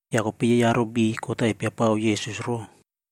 Ya kopei yei aro beiy kot-a epiapao Yesus ro,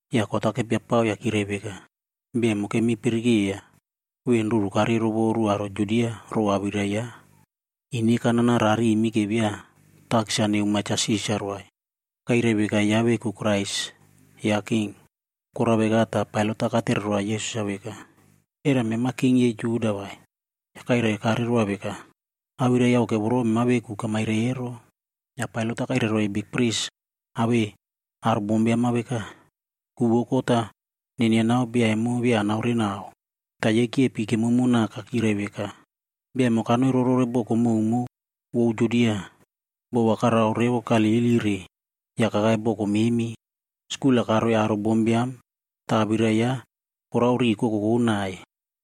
Ya kot-a kepiapao ya kyirai veka, “Bia emo kemi pirikeiya ven ruru karei rovoru aro Judia row awirai yaꞌa. Ine kanana rarimi ke via takis-a nemoa Cha Sisarb vai. Kairai veka yaꞌa veku Krais yaꞌa king.” Korao veka ta Pailat-a katere roa Yesus-a veka, “Era mema king yei Juda vai?” Ya kopei Yesus-a kairaikire roa veka, “Awirai yauke voro mema veku kamairai ero.” Ya Pailat-a kairai roiy bikpris awei aro bombiam-a veka, “Ku vou kot-a nenianao bia emo via anaorenao.” Ta yei kyepi kemomo naka kyirai veka. “Bia emo kanoi rorore boko mowmow vou Judia. Bo va karao revo Galili re ya kakai boko memi. Skul-a karoiy aro bombiam ta awirai yaꞌa korao riꞌi kokokoꞌ nai.”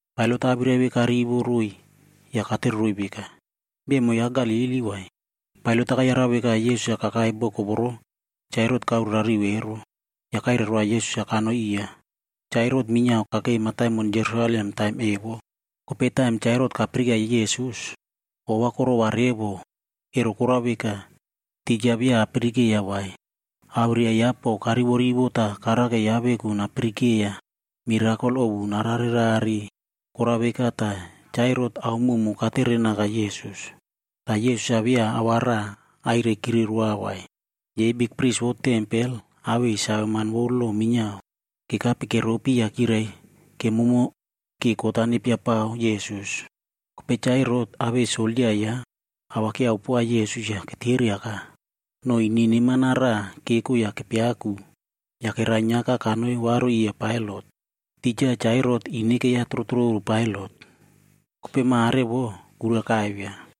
Pailat-a awirai ve karivo roiy ya katereroiy veka, “Bia emo yaꞌa Galili vai?” Pailat-a kayarau veka Yesus-a kakai boko voro Cha Herot kaorerariu ero, ya kairai roa Yesus-a kanoi iya. Cha Herot minyiao kakei mataimon pako Jerusalem taim evo. Kopei taim Cha Herot kapirikeiya Yesus, ova korova revo, ero korao veka, tija via apirikeiya vai. Awirai yaꞌa po karivorivo ta karake yaꞌa veku napirikeiya mirakol ovu nararerare. Korao veka ta Cha Herot ao mowmow katere naka Yesus. Ta Yesus-a via a va raꞌa airaikire roa vai. Yei bikpris vou tempel awei saveman vou lo minyiao kekape keropi ya kyirai kemomo ke kot-a nepiapao Yesus. Kopei Cha Herot awei soldia yaꞌa kerovoriaka Yesus ya keteriaka. No ine neman-a raꞌa keko ya kepiakuc ya kerainyiaka kanoi varu iya Pailat. Tija Cha Herot ine keiya trotroru Pailat, kopei mare vo kura kaivia.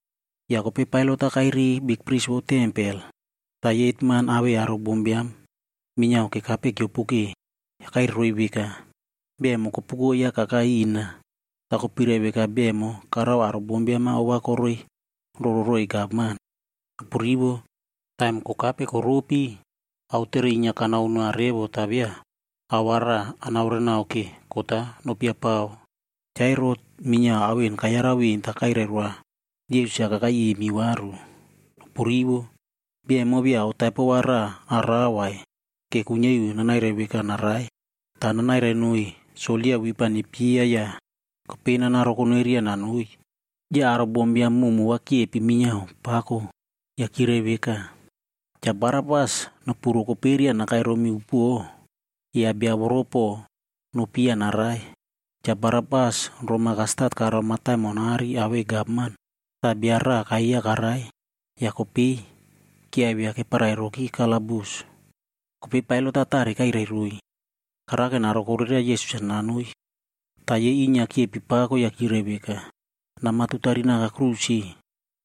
Ya kopei Pailat-a kairiy bikpris vou tempel, ta yei hetman awei aro bombiam minyiao kekape kyiopoke. Ya kairai roiy veka, “Bia emo kopuko yaꞌa kakai ina, ta kopirai veka bia emo karao aro bombiam-a ova koreiroro roiy gavman. Nopurivo! Taim kokape koropi, aotere inyia kanao noa revo ta via ao va raꞌa anaorenao ke kot-a nopiapao. Cha Herot minyiao ao en kayarau ven ta kairai roa Yesus-a kakai imi varu. Nopurivo. Bia emo via ao taipo va raꞌa arao vai, ke kuinyia iu nanairai veka narai. Ta nanairai noiy soldia wip-a nepyeiya ya kopei nanarokoneria nanoi.”d Ya aro bombiam mowmow va kyepi minyiao pako ya kyirai veka, “Cha Barabas nopu rokoperia nakai romi upuo, ya bia voro po nopyeiya narai!” Cha Barabas roma kastat karao mataimon aꞌari awei gavman ta bia raꞌa kayeiya karai. Ya kopei kyiaivia keparairoki kalabus. Kopei Pailat-a tare kairai roiy, karake narokoreria Yesus-a nanoi. Ta yei inyia kyepi pako ya kyirai veka, “Nama tutari naka aꞌai tiriki!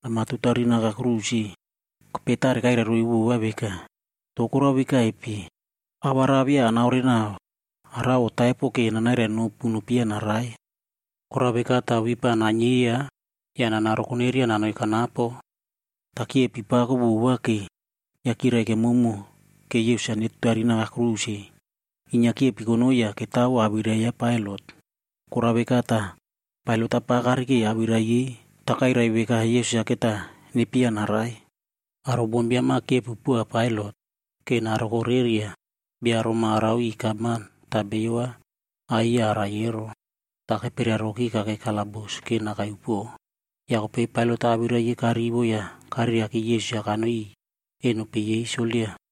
Nama tutari naka aꞌai tiriki!” Kopei tare kairai roiy vova veka “To korao vekaipe? Ao va raꞌa via anaorenao arao otaipo ke nanairai nopu nopyeiya narai. Korao veka ta wip-a nainyeiya ya nanarokoneria nanoi kanapo.” Ta kyepi pako vova ke, ya kyirai kemomo ke Yesus-a netutari naka aꞌai tiriki. Inyia kyepi konoi ya ketawo awirai ya Pailat. Korao veka ta Pailat-a pa karike awirai yei ta kairai veka Yesus-a keta nepyeiya narai. Aro bombiam-a kyepi poa Pailat ke narokoreria bia roma arao iꞌiy gavman ta bio va ayeiya arai ero. Ta keperiaroki kakei kalabus ke nakai upuo. Ya kopei Pailat-a awirai yei karivo ya kareriaki Yesus-a kanoi iꞌiy eno peꞌe yei soldia.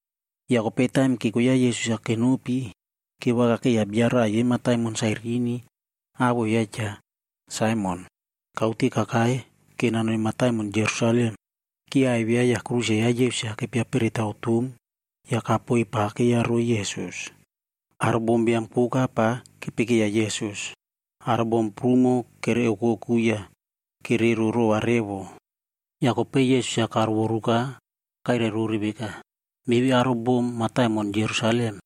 Ya kopei taim keko yaꞌa Yesus-a kenopi, kevakakeiya bia raꞌa yei mataimon Sairini awoꞌo yaꞌa Cha Saimon. Kaute kakai ke nanoi mataimon pako Jerusalem. Kyiaivia ya aꞌai tiriki ya Yesus-a kepia peretaw tom ya kapoiy pa keiyaroi Yesus. Aro bombiam koka pa kepikeiya Yesus. Aro bom prumo kere okoku ya kerero rova revo. Ya kopei Yesus-a karovoruka ya kairai rore veka, “Meve aro bom mataimon Jerusalem,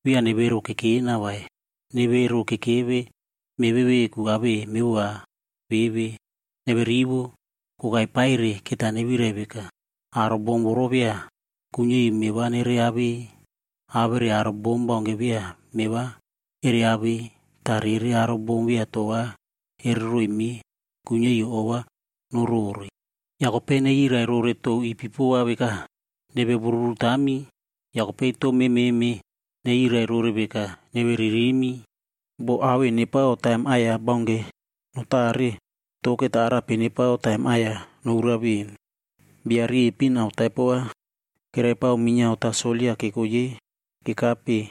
via nevero kekena vai. Nevero kekeve meve veku awei mevova meve. Neverivo. Kokai paire keta nevirai veka, ‘Aro bom voro via kuinyia iu meꞌe va nere awei, awere aro bom baunke via meꞌe va ere awei, ta rere aro bom via toꞌo va ere roiy meꞌe, kuinyia iu ova norore.’ ‘Ya kopei nerirai rore tou ipipo va veka, “Neve woruru tami,” ya kopei tou mememe nerirai rore veka, Bo ao en nepao taim aꞌai-ya baunke notare, to keta arape nepao taim aꞌai-ya nouraf ven?” Bia riepin ao taipo va keraipao minyiao ta soldia keko yei kekape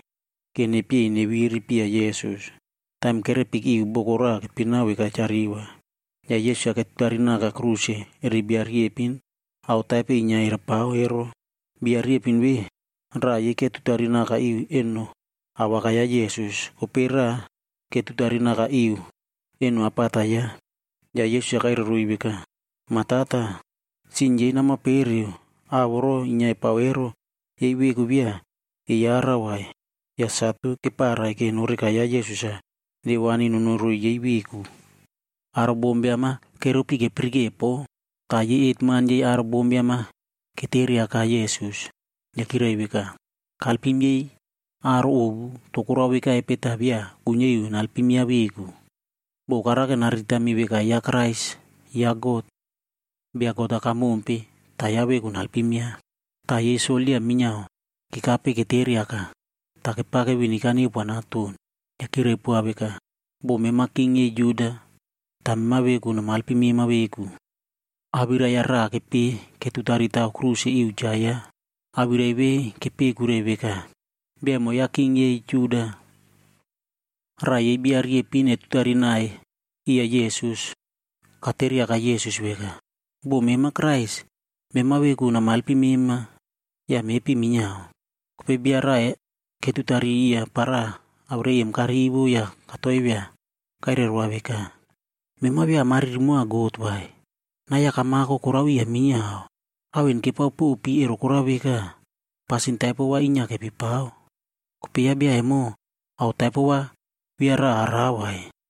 ke nepyei neviri piya Yesus. Taim kerepiki iu boko raꞌa keipinao veka Cha Reva, ya Yesus-a ketutari naka aꞌai tiriki eri bia riepin ao taipo inyia eraipao ero. Bia riepin ve, raꞌa yei ketutari naka iu eno awakai ya Yesus. Kopei raꞌa, ketutari naka iu eno apata yaꞌa. Ya Yesus-a kairai veka, “Ma Tata, sin yei nama pereu. Ao voro inyia epao ero, yei veku via eyarau vai.” Ya satu keparai ke noreka ya Yesus-a newani nonoi roiy yei veku. Aro bombiam-a keropi kepirike po, ta yei hetman yei aro bombiam-a keteriaka Yesus. Ya kyirai veka, “Kalpim yei aro ovu, to korao vekaipe ta via kuinyia iu nalpim yaꞌa veku? Bo karake nariritami veka yaꞌa Krais ya God, Bia God-a kamompe, ta yaꞌa veku nalpim yaꞌa.” Ta yei soldia minyiao kekape keteriaka, ta kepake viniga neupoa naton. Ya kyirai poa veka, “Bo mema king yei Juda, ta mema veku nama elpim mema veku.” Awirai-ya raꞌa kepeꞌe ketutari taw aꞌai tiriki iu cha yaꞌa. Awirai ve kepeꞌe kuirai veka: BIA EMO YAꞌA KING YEI JUDA. Raꞌa yei bia riepin etutari nai iya Yesus, kateriaka Yesus veka, “Bo mema Krais, mema veku nama elpim mema ya mepi minyiao.” Kopei bia raꞌa ketutari iya para, awirai em karivo ya katoivia kairai roa veka, “Mema via amariri moa God vai? Nai-ya kamako korao iya minyiao. Ao en kepaopopi ero korao veka, pasin taipo va inyia kepipao. Kopei ya bia emo, ao taipo va via raꞌa arao vai.”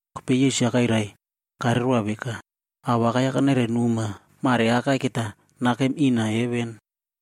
Kopei Yesus-a kairaikire roa veka, “Awakai-ya kanairai noma, mareakai keta nakem ina heven.”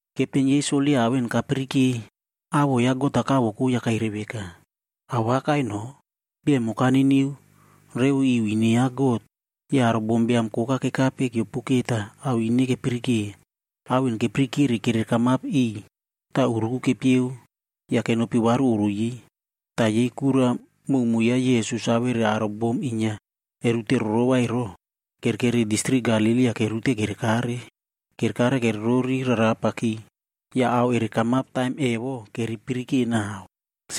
Kepten yei soldia ao en kapirike, awoꞌo ya God-a kavoko ya kairai veka, “Awakai no, bia emo kaniniu revo iu ine ya God.” Ya aro bombiam koka kekape kyiopoke ta ao ine kepirike. Ao en kepirikere kerekamap iꞌiy ta uruku kepyeug ya kenopi varu oꞌro yei. Ta yei kura mowmow yaꞌa Yesus awere aro bom inyia erute rorova ero, kerekeri distrik Galili ya kereute kerekare. Kerekare kererori rarapaki, ya ao ere kamap taim evo kerepirike nau.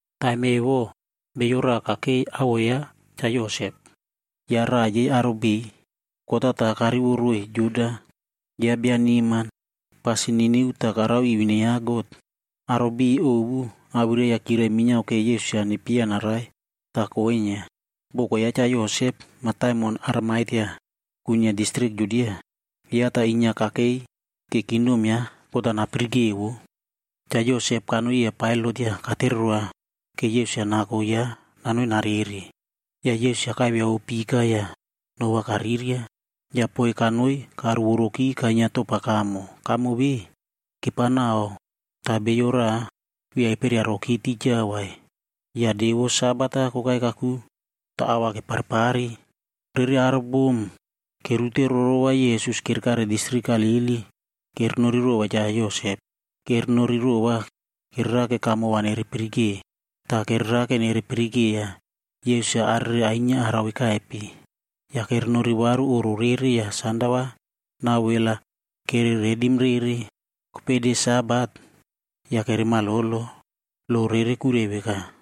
Taim evo bio raꞌa kakei awoꞌo yaꞌa Cha Yosep. Yaꞌa raꞌa yei aro beiy kot-a ta karivo roiy Juda. Yaꞌa bia neman, pasin niniu ta karao iu ine ya God. Aro beiy ovu awirai-ya kyirai minyiao ke Yesus-a nepyeiya narai, ta koinyia. Boko ya Cha Yosep, mataimon Arimatea kuinyia distrik Judia. Yaꞌa ta inyia kakei ke kingdom ya God-a napirike vo. Cha Yosep kanoi iya Pailat ya katere roa ke Yesus-a nako yaꞌa nanoi narere. Ya Yesus-a kaiviao pika ya no va kariria ya poiy kanoi karuvoroki kainyia topa kamo. Kamo ve, kepaonao ta bio raꞌa via eperiaroki tija vai. Ya de vou Sabat-a kokai kakuke ta ao va keparepare. Rere aro bom inyia kereute rorova Yesus kerekare distrik Galili, kerenori rova Cha Yosep. Kerenori rova kererake kamo va nere pirikeo, ta kererake nerepirikeiya Yesus-a arere ainyia arao vekaipe. Ya kerenori varu oꞌro rere ya sanda va nau wel-a kere redim rere. Kopei de Sabat, ya keremalolo. Lo rere kuirai veka.